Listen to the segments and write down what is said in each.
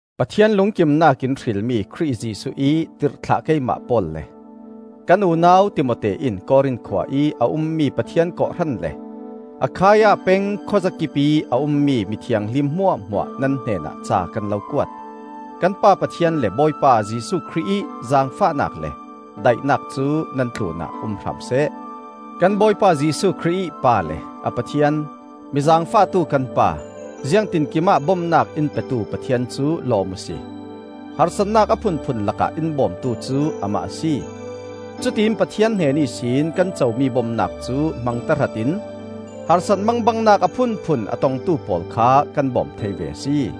Pathian lungkimnak in hrilmi Khrih Jesuh ih tirhthlah keimah Paul le kan unau Timote in Korin khua ih a ummi Pathian kawhhran le Akhaia peng khuazakipih a ummi mithianghlim hmuahhmuah nan hnenah ca kan lo kuat. Kan Pa Pathian le Bawipa Jesuh Khrih ih zaangfahnak le daihnak cu nan tlunah um hram seh. Kan Bawipa Jesuh Khrih ih Pa le a Pathian, mi zaangfahtu kan Pa, ziangtinkim ah bomnak in petu Pathian cu lawm uhsi! Harsatnak a phunphun lakah in bawmtu cu Amah a si; cutiin Pathian hnen ihsin kan comi bomnak cu hmang tahratin harsat mangbangnak a phunphun a tongtu pawl kha kan bawm thei ve a si.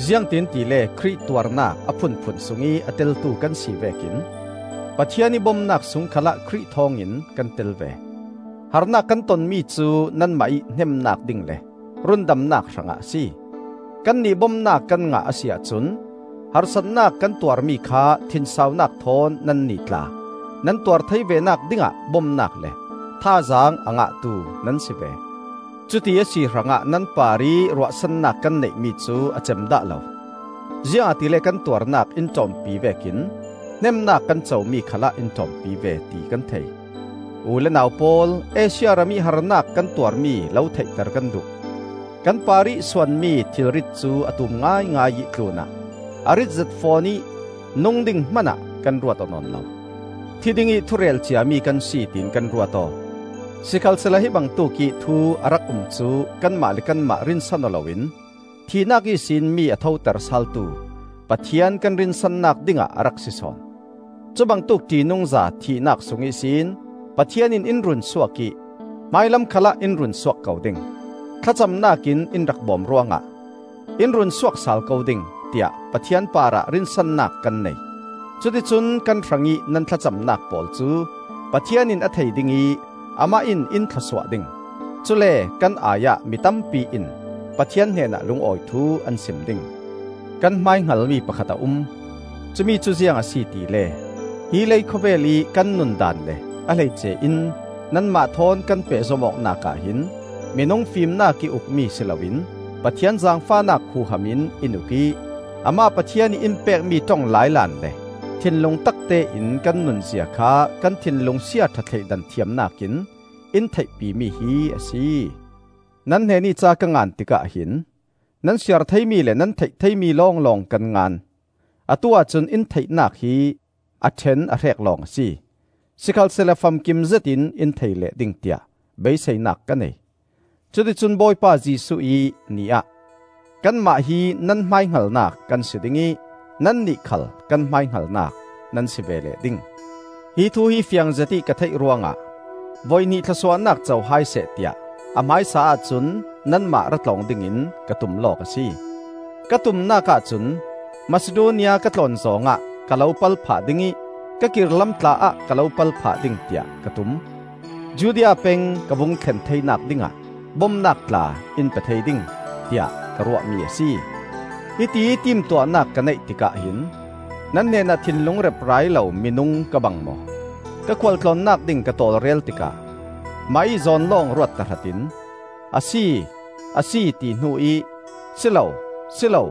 Ziangtin tile Khrih tuarnak a phunphun sungih a teltu kan si vekin Pathian ih bomnak sung khalah Khrih thawngin kan tel ve. Harnak kan tonmi cu nanmah ih hnemnak ding le rundamnak hrangah a si. Kannih bomnak kan ngah a si ahcun harsatnak kan tuarmi kha thinsaunak thawn nannih tla nan tuar thei venak dingah bomnak le thazaang a ngahtu nan si ve. Cuti a si hrangah nan parih ruahsannak kan neihmi cu a cem dah lo. Ziangahtile kan tuarnak in ṭawmpi vekin hnemnak kan comi khalah in ṭawmpi ve, ti kan thei. U le nau pawl, Asia ramih harnak kan tuarmi lo theihter kan duh. Kan parih suanmi thilrit cu a tum ngaingai ih tlunah a rit zet fawn ih nung ding hmanah kan ruat aw nawn lo. Thi dingih thurel ciami kan si, tiin kan ruat aw. Sikhalsehla hi bangtuk ih thu a rak um cu kanmah le kanmah rinsan aw loin thihnak ihsin mi a thoter saaltu Pathian kan rinsannak dingah a rak si sawn. Cubangtuk ṭihnungza thihnak sung ihsin Pathian in in runsuak ih hmailam khalah in runsuak ko ding. Thlacamnak in in rak bom ruangah, in runsuak sal ko ding, tiah Pathian parah rinsannak kan nei. Cuticun kan hrangih nan thlacamnak pawl cu Pathian in a thei ding ih Amah in in thlawsuah ding. Cule kan ai-ah mi tampi in Pathian hnenah lungawi thu an sim ding. Kan hmaihngalmi pakhat a um; cumicu ziang a si tile: hi leikhawvel ih kan nundaan le a hleice in nanmah thawn kan pehzom awknak ah hin minung fimnakih ukmi si loin Pathian zaangfahnak huham in in uk ih, Amah Pathian ih in pekmi ṭong lailan#Lailan timi hi Kutngan cabu hrekkhat ahcun thianghlim ti in a um. le thinlung taktein kan nunzia kha kan thinlung siaṭha thleidan thiamnak in in theihpimi hi a si. Nan hnenih ca ka ngan tikah hin nan siar theimi le nan theih theimi lawnglawng kan ngan. Atu-ah cun in theihnak hi a ṭhen a hrek lawng a si; sikhalsehla famkim zetin in thei leh ding tiah beiseinak ka nei; cuticun Bawipa Jesuh ih Ni ah kanmah hi nan hmaihngalnak kan si ding ih nannih khal kan hmaihngalnak nan si ve leh ding. Hi thu hi fiangzet ih ka theih ruangah voihnih thlawsuahnak co hai seh tiah a hmaisa ahcun nanmah ra tlawng dingin ka tum lawk a si. Ka tumnak ahcun Masidonia ka tlawn zawng ah ka lo pal phah ding ih ka kir lam tla-ah ka lo pal phah ding tiah ka tum; Judea peng ka vung thlen theinak dingah bomnak tla in pe thei ding, tiah ka ruahmi a si. Hitiih timtuahnak ka neih tikah hin nan hnenah thinlung reprai lo minung ka bang maw? Ka khualtlawnnak ding ka tawlrel tikah mah ih zawn lawng ruat tahratin, “A si, a si,” ti hnu ih “Si lo, si lo,”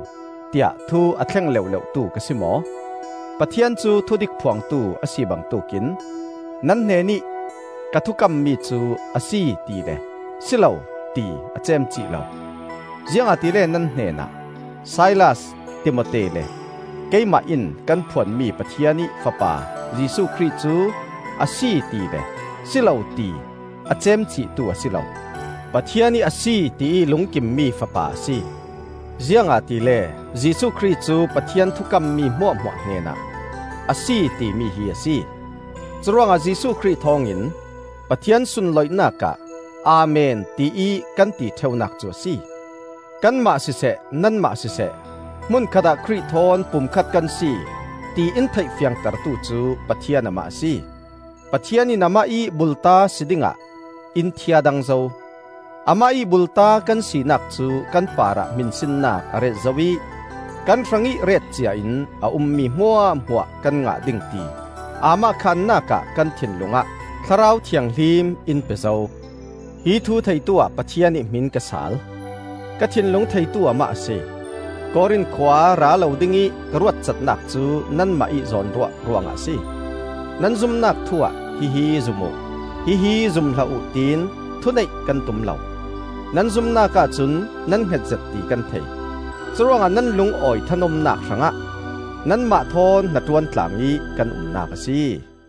tiah thu a thleng leuhleuhtu ka si maw? Pathian cu thudik phuangtu a si bangtuk in nan hnenih ka thukammi cu “A si,” ti le “Si lo,” ti a ceemcih lo. Ziangahtile nan hnenah, Silas, Timote, le keimah in kan phuanmi Pathian ih Fapa Jesuh Khrih cu “Asi,” tile “Silo,” ti a ceemcihtu a si lo. Pathian ih “Asi,” tiih lungkimmi fapa a si. Ziangahtile Jesuh Khrih cu Pathian thukammi hmuahhmuah hnenah “Asi,” timi hi a si. Curuangah Jesuh Khrih thawngin Pathian sunloihnak ah “Amen,” tiih kan ti ṭheunak cu a si. Kanmah siseh, nanmah siseh, hmun khatah Khrih thawn pumkhat kan si, ti in theih fiangtertu cu Pathian Amah a si. Pathian in Amah ih bulta si dingah in thiadang zo. Amah ih bulta kan sinak cu kan parah hminsinnak a ret zo ih kan hrangih ret ciain a ummi hmuahhmuah kan ngah ding ti aamahkhannak ah kan thinlung ah Thlarau Thianghlim in pe zo. Hi thu theituah Pathian ih hmin ka saal: ka thinlung theitu Amah a si. Korin khua ra lo dingih ka ruatcatnak cu nanmah ih zawnruah ruangah a si. Nan zumnak thu-ah hihi zum uh, hihi zum hlah uh tiin thuneih kan tum lo. Nan zumnak ahcun nan hngetzet ti kan thei. Curuangah nan lungawi thanuamnak hrangah nanmah thawn hnaṭuan tlang ih kan umnak a si.